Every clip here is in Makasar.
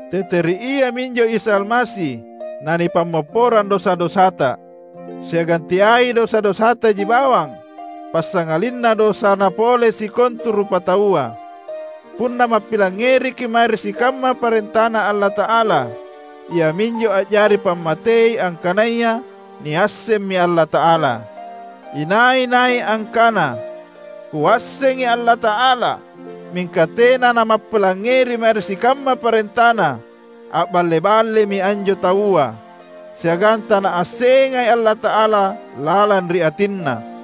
Tete ri Ia minjo Isa Almasi nanipammopporang dosa-dosata. Siagang teai dosa-dosataji bawang, passangalinna dosana pole sikontu rupataua. Punna mappilangngeriki’ mae ri sikamma parentaNa Allata’ala, iaminjo a’jari pammatei angkanaya niassemmi Allata’ala. Inai-nai angkana, "Kuassengi Allata’ala," mingka tena namappilangngeri mae ri sikamma parentaNa, a’balle-ballemi anjo taua, siagang tanaassengai Allata’ala lalang ri atinna.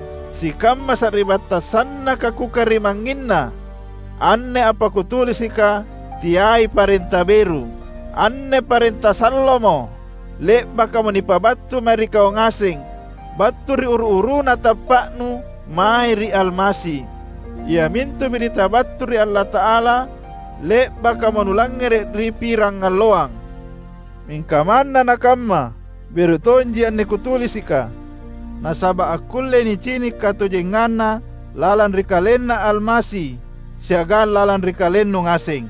Sikamma sari’battang sannaka kukarimangnginna! Anne apa kutulisika teai parenta beru. Anne parenta sallomo, le’bakamo nipabattu mae ri kau ngaseng battu ri uru-uruna tappa’nu mae ri Almasi; iamintu biritta battu ri Allata’ala le’bakamo nulangngere’ ri pirangalloang. Mingka manna nakamma, beru tonji anne kutulisika; nasaba’ akkullei nicini’ katojenganna lalang ri KalenNa Almasi siagang lalang ri kalennu ngaseng.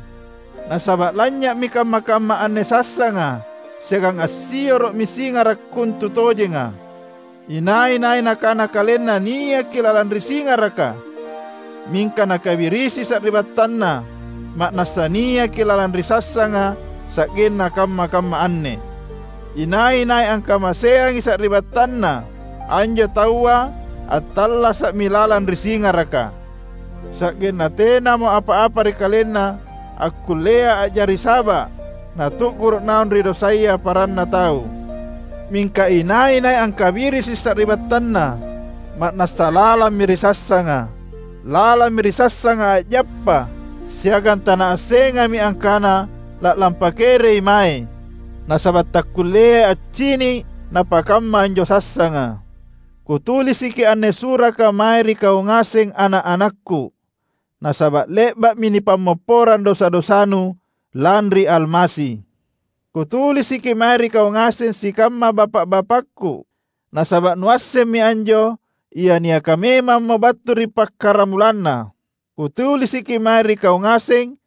Nasaba’ lanynya’mi kamma-kamma anne sassanga siagang assioro’mi singara’ kontutojenga. Inai-nai nakana kalenna niaki lalang ri singaraka mingka nakabirisi sari’battanna, ma’nassa niaki lalang ri sassanga sa’genna kamma-kamma anne. Inai-nai angkamaseangi sari’battanna, anjo taua attallasa’mi lalang ri singaraka, sa’genna tenamo apa-apa ri kalenna akkullea a’jari saba’ natu’guru’ naung ri dosaya paranna tau. Mingka inai-nai angkabirisi sari’battanna, ma’nassa lalammi ri sassanga. Lalammi ri sassanga a’jappa, siagang tanaassengami angkana la’lampa kereimae, nasaba’ takkulleai accini’ napakamma anjo sassanga. Kutulisiki anne suraka mae ri kau ngaseng ana’-anakku, nasaba’ le’ba’mi nipammopporang dosa-dosanu lanri Almasi. Kutulisiki mae ri kau ngaseng sikamma bapa’-bapakku, nasaba’ nuassemmi anjo Ia niaka memammo battu ri pakkaramulanna. Kutulisiki mae ri kau ngaseng,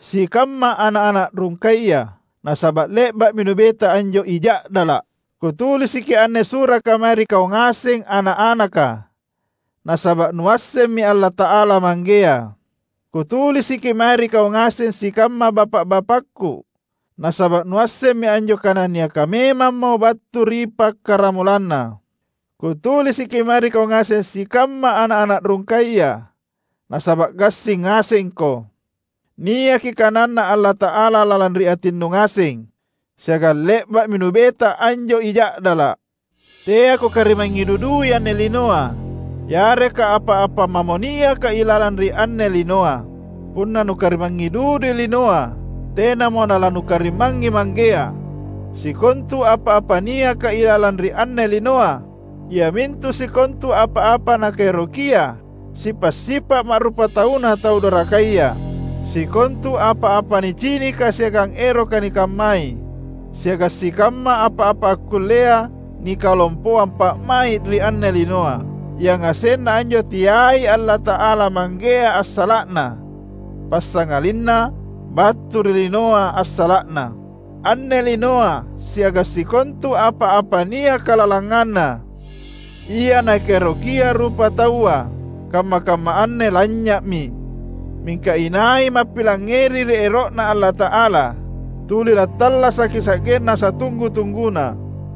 sikamma ana’-ana’ rungkaya, nasaba’ le’ba’mi nubeta anjo I Ja’dala’. Kutulisiki anne suraka mae ri kau ngaseng ana’-anaka nasaba’ nuassemmi Allata’ala Manggea. Kutulisiki mae ri kau ngaseng sikamma bapa’-bapakku, nasaba’ nuassemmi anjo Kana niaka memammo battu ri pakkaramulanna. Kutulisiki mae ri kau ngaseng sikamma ana’-ana’ rungkaya, nasaba’ gassing ngasengko. Niaki kananNa Allata’ala lalang ri atinnu ngaseng, siagang le’ba’mi nubeta anjo I Ja’dala’. Teako karimangngi dudui anne linoa, yareka apa-apa mamo niaka ilalang ri anne linoa. Punna nukarimangngi dudui linoa, tenamo nalanukarimangngi Manggea. Sikontu apa-apa niaka ilalang ri anne linoa, iamintu sikontu apa-apa nakaerokia sipa’-sipa’ ma’rupatauna tau dorakaya, sikontu apa-apa nicinika siagang eroka nikammai, siagang sikamma apa-apa akkullea nikalompoang pa’mai’ ri anne linoa, yangasenna anjo teai Allata’ala Manggea assala’na: passangalinna battu ri linoa assala’na. Anne linoa siagang sikontu apa-apa niaka lalanganna, ia nakaerokia rupataua, kamma-kamma anne lanynya’mi. Mingka inai mappilangngeri ri ero’Na Allata’ala, tuli lattallasaki sa’genna satunggu-tungguna.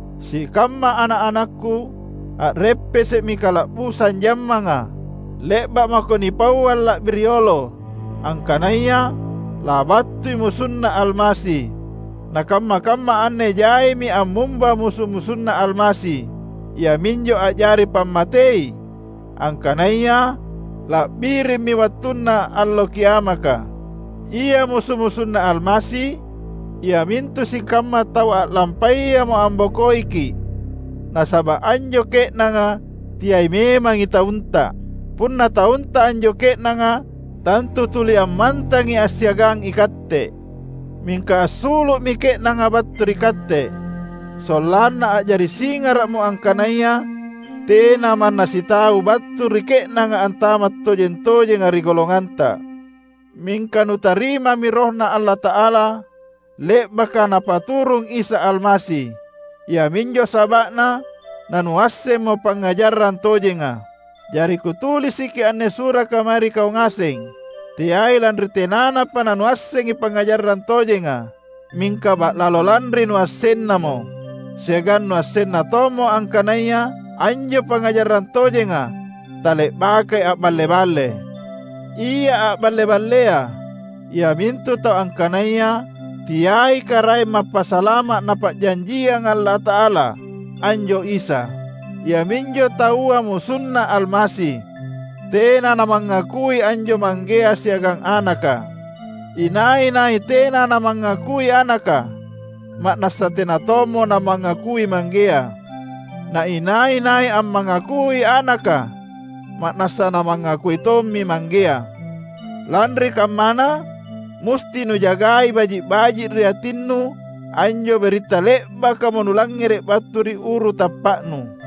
Sikamma ana’-anakku, a’reppese’mi kala’busang jammanga! Le’ba’ mako nipauang la’bi riolo angkanaya labattui MusunNa Almasi; na kamma-kamma anne jaimi ammumba musu-musunNa Almasi. Iaminjo a’jari pammatei angkanaya la’birimmi wattunna Allo Kiamaka. Ia musu-musunNa Almasi, iamintu sikamma tau a’lampayamo ambokoiki’, nasaba’ anjo ke’nanga teai memangi taunta. Punna taunta anjo ke’nanga, tantu tuli ammantangi assiagang ikatte. Mingka assulu’mi ke’nanga battu ri katte, sollanna a’jari singara’mo angkanaya tena manna sitau battu ri ke’nanga antama’ tojeng-tojenga ri golonganta. Mingka nutarimami RohNa Allata’ala, le’baka Napaturung Isa Almasi. Iaminjo saba’na nanuassemmo pangngajarang tojenga. Jari kutulisiki anne suraka mae ri kau ngaseng teai lanri tenanapa nanuassengi pangngajarang tojenga, mingka ba’lalo lanri nuassennamo; siagang nuassenna tommo angkanaya anjo pangngajarang tojenga tale’bakai a’balle-balle. Ia a’balle-ballea iamintu tau angkanaya teai Karaeng Mappasalama’ Napa’janjianga Allata’ala anjo Isa. Iaminjo taua MusunNa Almasi; tena namangakui anjo Manggea siagang Anaka. Inai-nai tena namangakui Anaka, ma’nassa tena tommo namangakui Manggea. Na inai-nai ammangakui Anaka, ma’nassa namangakui tommi Manggea. Lanri kammana, musti nujagai baji’-baji’ ri atinnu anjo biritta le’bakamo nulangngere’ battu ri uru tappa’nu.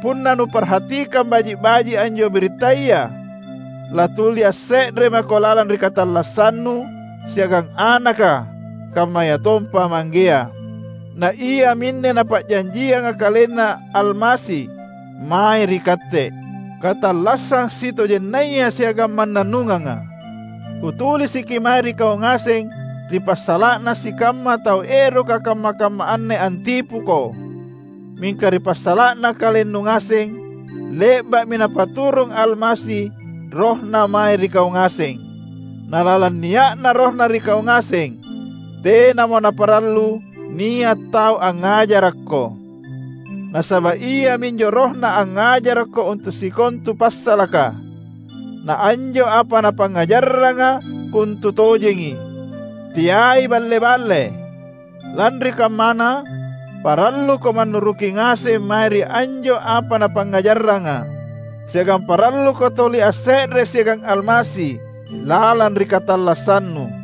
Punna nuparhatikang baji’-baji’ anjo birittaya, latuli asse’re mako lalang ri katallassannu siagang Anaka kammayatompa Manggea. Na iaminne Napa’janjianga KalenNa Almasi mae ri katte: Katallassang sitojennaya siagang mannannunganga. Kutulisiki mae ri kau ngaseng ri passala’na sikamma tau eroka kamma-kamma anne antipuko. Mingka ri passala’na kalennu ngaseng, le’ba’mi Napaturung Almasi RohNa mae ri kau ngaseng. Na lalang nia’na RohNa ri kau ngaseng, tenamo naparallu nia’ tau angngajarakko. Nasaba’ iaminjo RohNa angngajarakko untu’ sikontu passalaka; na anjo apa Napangngajarranga kontutojengi, teai balle-balle. Lanri kammana, paralluko mannuruki ngaseng mae ri anjo apa Napangngajarranga; siagang paralluko tuli asse’re siagang Almasi lalang ri katallassannu.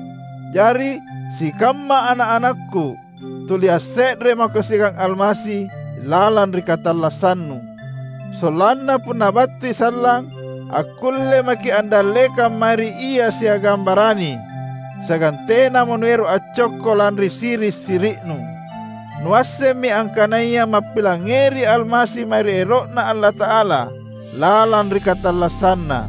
Jari, sikamma ana’-anakku, tuli asse’re mako siagang Almasi lalang ri katallassannu, sollanna punna battui sallang, akkulle maki’ andallekang mae ri Ia siagang barani; siagang tenamo nuero’ accokko lanri siri’-siri’nu. Nuassemmi angkanaya mappilangngeri Almasi mae ri ero’Na Allata’ala lalang ri katallassanNa.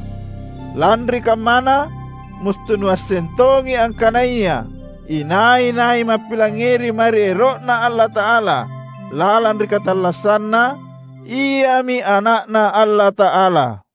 Lanri kammana, musti nuasseng tongi angkanaya inai-nai mappilangngeri mae ri ero’Na Allata’ala lalang ri katallassanna, iami ana’Na Allata’ala.